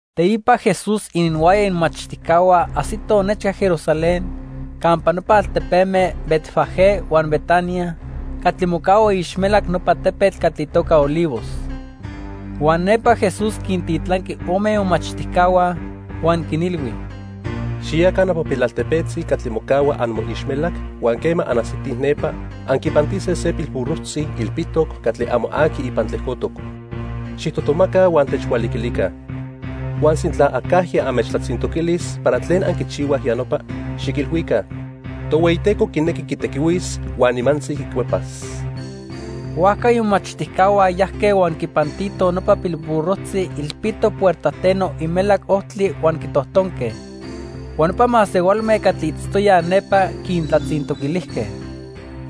Teipa Jesús ininhuaya imomachtijcahua ajsitoj nechca Jerusalén campa nopa altepeme Betfagé huan Betania, catli mocahua iixmelac nopa tepetl catli itoca Olivos. Huan nepa Jesús quintitlanqui ome imomachtijcahua, huan quinilhui: —Xiyaca nopa pilaltepetzi catli mocahua amoixmelac huan quema anajsitij nepa, anquipantise se pilburrojtzi ilpitoc, catli amo aqui ipan tlejcotoc. Xijtojtomaca huan techhualiquilica. Huan sintla acajya anmechtlatzintoquilis para tlen anquichihuaj ya nopa, xiquilhuica: 'Tohueyiteco quinequi quitequihuis huan nimantzi quicuepas.' Huajca imomachtijcahua yajque huan quipantitoj nopa pilburrojtzi ilpitoc puertajteno imelac ojtli huan quitojtonque. Huan nopa masehualme catli itztoyaj nepa quintlatzintoquilijque: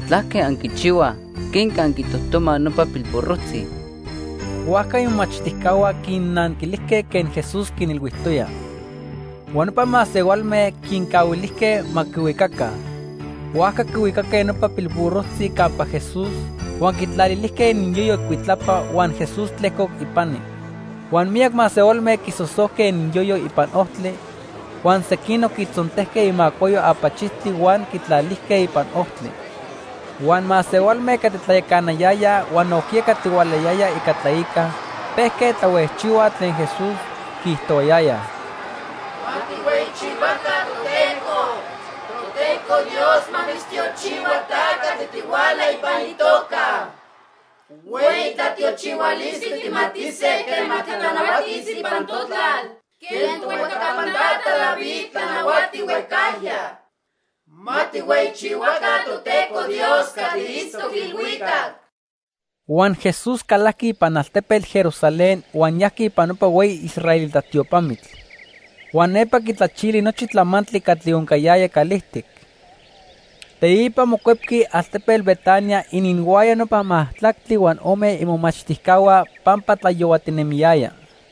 —¿Tlaque anquichihuaj? ¿Quenque anquitojtomaj nopa pilburrojtzi? Huajca imomachtijcahua quinnanquilijque quen Jesús quinilhuijtoya. Huan nopa masehualme quincahuilijque ma quihuicaca. Huajca quihuicaque nopa pilburrojtzi campa Jesús huan quitlalilijque ininyoyo icuitlapa huan Jesús tlejcoc ipani. Huan miyac masehualme quisosojque ininyoyo ipan ojtli, huan sequinoc quitzontejque imacuayo apachijtli huan quitlalijque ipan ojtli. Huan masehualme catli tlayacanayayaj huan nojquiya catli hualahuiyayaj ica tlaica pejque tlahuejchihuaj tlen Jesús, quiijtohuayayaj: ¡Ma tijhueyichihuaca Toteco! Toteco Dios ma mitztiochihua ta catli tihuala ipan itoca. Hueyi tlatiochihualistli tijmatise quema titlanahuatis ipan totlal quen tohuejcapan tata David tlanahuati huejcajya. ¡Ma tijhueyichihuaca Toteco Dios catli itztoc ilhuicac! Huan Jesús calajqui ipan altepetl Jerusalén huan yajqui ipan nopa hueyi israelita tiopamitl. Huan nepa quitlachili nochi tlamantli catli oncayaya calijtic. Teipa mocuepqui altepetl Betania ininhuaya nopa majtlactli huan ome imomachtijcahua pampa tlayohuatinemiyaya.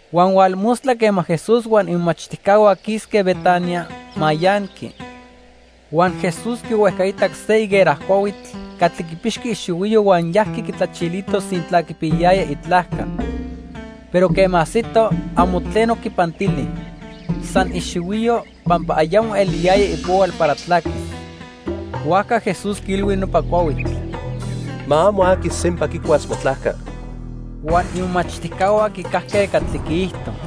Huan hualmostla quema Jesús huan imomachtijcahua quisque Betania, mayanqui. Huan Jesús quihuejcaitac se higuera cuahuitl catli quipixqui ixihuiyo huan yajqui quitlachilito sintla quipiyayaya itlajca. Pero quema ajsito, amo tleno quipantili, san ixihuiyo, pampa ayamo eliyaya ipohual para tlaquis. Huajca Jesús quiilhui nopa cuahuitl: —Ma amo aqui sempa quicuas motlajca. Huan imomachtijcahua quicajque catli quiijto.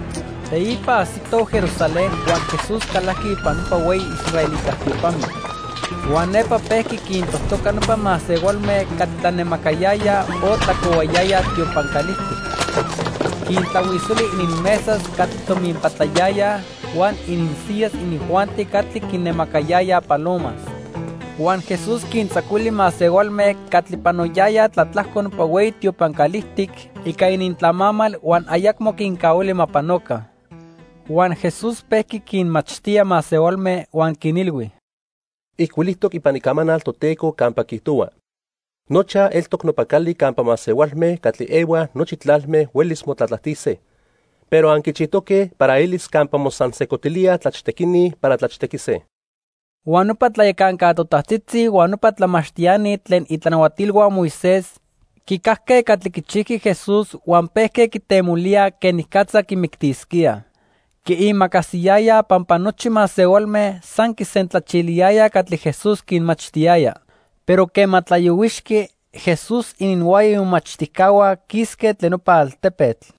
Teipa ajsitoj Jerusalén huan Jesús calajqui ipan nopa hueyi israelita tiopamitl. Huan nepa pejqui quintojtoca nopa masehualme catli tlanemacayayaj o tlacohuayayaj tiopan calijtic. Quintlahuisoli ininmesas catli tominpatlayayaj huan ininsiyas inijuanti catli quinemacayayaj palomas. Huan Jesús quintzacuili masehualme catli panoyayaj tlatlajco nopa hueyi tiopan calijtic ica inintlamamal huan ayacmo quincahuili ma panoca. Huan Jesús pejqui quinmachtía masehualme huan quinilhui: —Ijcuilijtoc ipan Icamanal Toteco campa quiijtohua: 'Nochaj eltoc nopa cali campa masehualme catli ehuaj nochi tlalme huelis motlatlajtise', pero anquichijtoque para elis campa mosansejcotilíaj tlachtequini para tlachtequise. Huan nopa tlayacanca totajtzitzi huan nopa tlamachtiani tlen itlanahuatilhua Moisés quicajque catli quichijqui Jesús huan pejque quitemolíaj quenicatza quimictisquíaj. Quiimacasiyayaj pampa nochi masehualme san quisentlachiliyayaj catli Jesús quinmachtiyaya. Pero quema tlayohuixqui, Jesús ininhuaya imomachtijcahua quisque tlen nopa altepetl.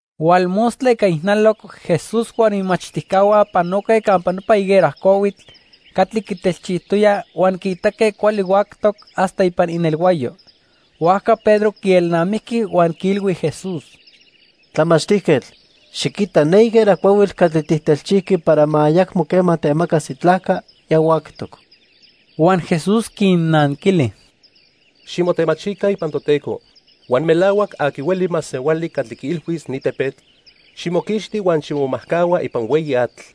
Hualmostla ica ijnaloc Jesús huan imomachtijcahua panoque campa nopa higuera cuahuitl catli quitelchijtoya huan quiitaque cuali huactoc hasta ipan inelhuayo. Huajca Pedro quielnamijqui huan quiilhui Jesús: —Tlamachtijquetl, xiquita ne higuera cuahuitl catli tijtelchijqui para ma ayacmo quema temacas itlajca, ya huactoc. Huan Jesús quinnanquili: —Ximotemachica ipan Toteco, huan melahuac aqui hueli masehuali catli quiilhuis ni tepetl: 'Ximoquixti huan ximomajcahua ipan hueyi atl',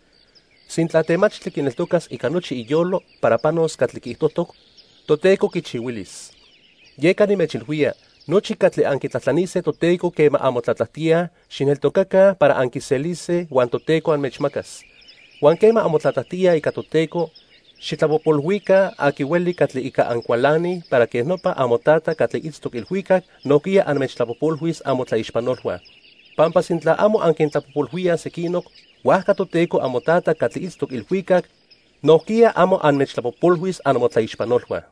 sintla temachtli quineltocas ica nochi iyolo para panos catli quiijtojtoc, Toteco quichihuilis. Yeca nimechilhuía, nochi catli anquitlajtlanise Toteco quema anmotlatlajtíaj, xijneltocaca para anquiselise huan Toteco anmechmacas. Huan quema anmotlatlajtíaj ica Toteco, xijtlapojpolhuica aqui hueli catli ica ancualanij para quej nopa amoTata catli itztoc ilhuicac nojquiya anmechtlapojpolhuis amotlaixpanolhua. Pampa sintla amo anquintlapojpolhuíaj sequinoc, huajca Toteco amoTata catli itztoc ilhuicac nojquiya amo anmechtlapojpolhuis amotlaixpanolhua.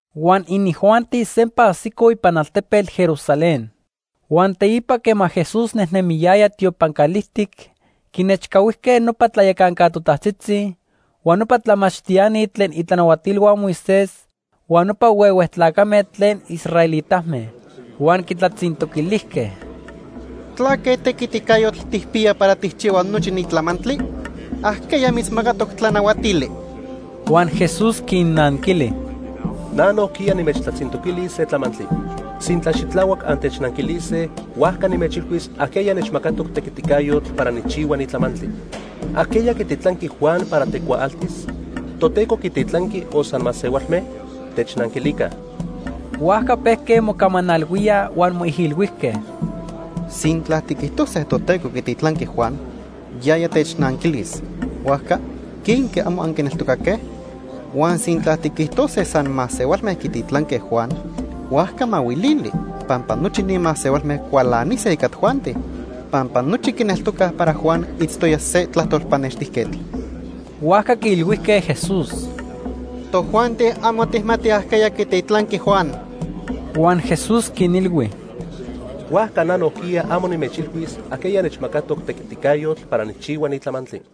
Huan inijuanti sempa ajsicoj ipan altepetl Jerusalén. Huan teipa quema Jesús nejnemiyaya tiopan calijtic, quinechcahuijque nopa tlayacanca totajtzitzi, huan nopa tlamachtiani tlen itlanahuatilhua Moisés huan nopa huehue tlacame tlen israelitame. Huan quitlatzintoquilijque: —¿Tlaque tequiticayotl tijpiya para tijchihua nochi ni tlamantli? ¿Ajqueya mitzmacatoc tlanahuatili? Huan Jesús quinnanquili: —Na nojquiya nimechtlatzintoquilis se tlamantli. Sintla xitlahuac antechnanquilise, huajca nimechilhuis ajqueya nechmacatoc tequiticayotl para nijchihua ni tlamantli. ¿Ajqueya quititlanqui Juan para tecuaaltis? ¿Toteco quititlanqui o san masehualme? Technanquilica. Huajca pejque mocamanalhuíaj huan moijilhuijque: —Sintla tiquijtose Toteco quititlanqui Juan, yaya technanquilis: 'Huajca, ¿quenque amo anquineltocaque?' Huan sintla tiquijtose san masehualme quititlanque Juan, huajca mahuilili, pampa nochi ni masehualme cualanise ica tojuanti. Pampa nochi quineltocaj para Juan itztoya se tlajtol pannextijquetl. Huajca quiilhuijque Jesús: —Tojuanti amo tijmatij ajqueya quititlanqui Juan. Huan Jesús quinilhui: —Huajca na nojquiya amo nimechilhuis ajqueya nechmacatoc tequiticayotl para nijchihua ni tlamantli.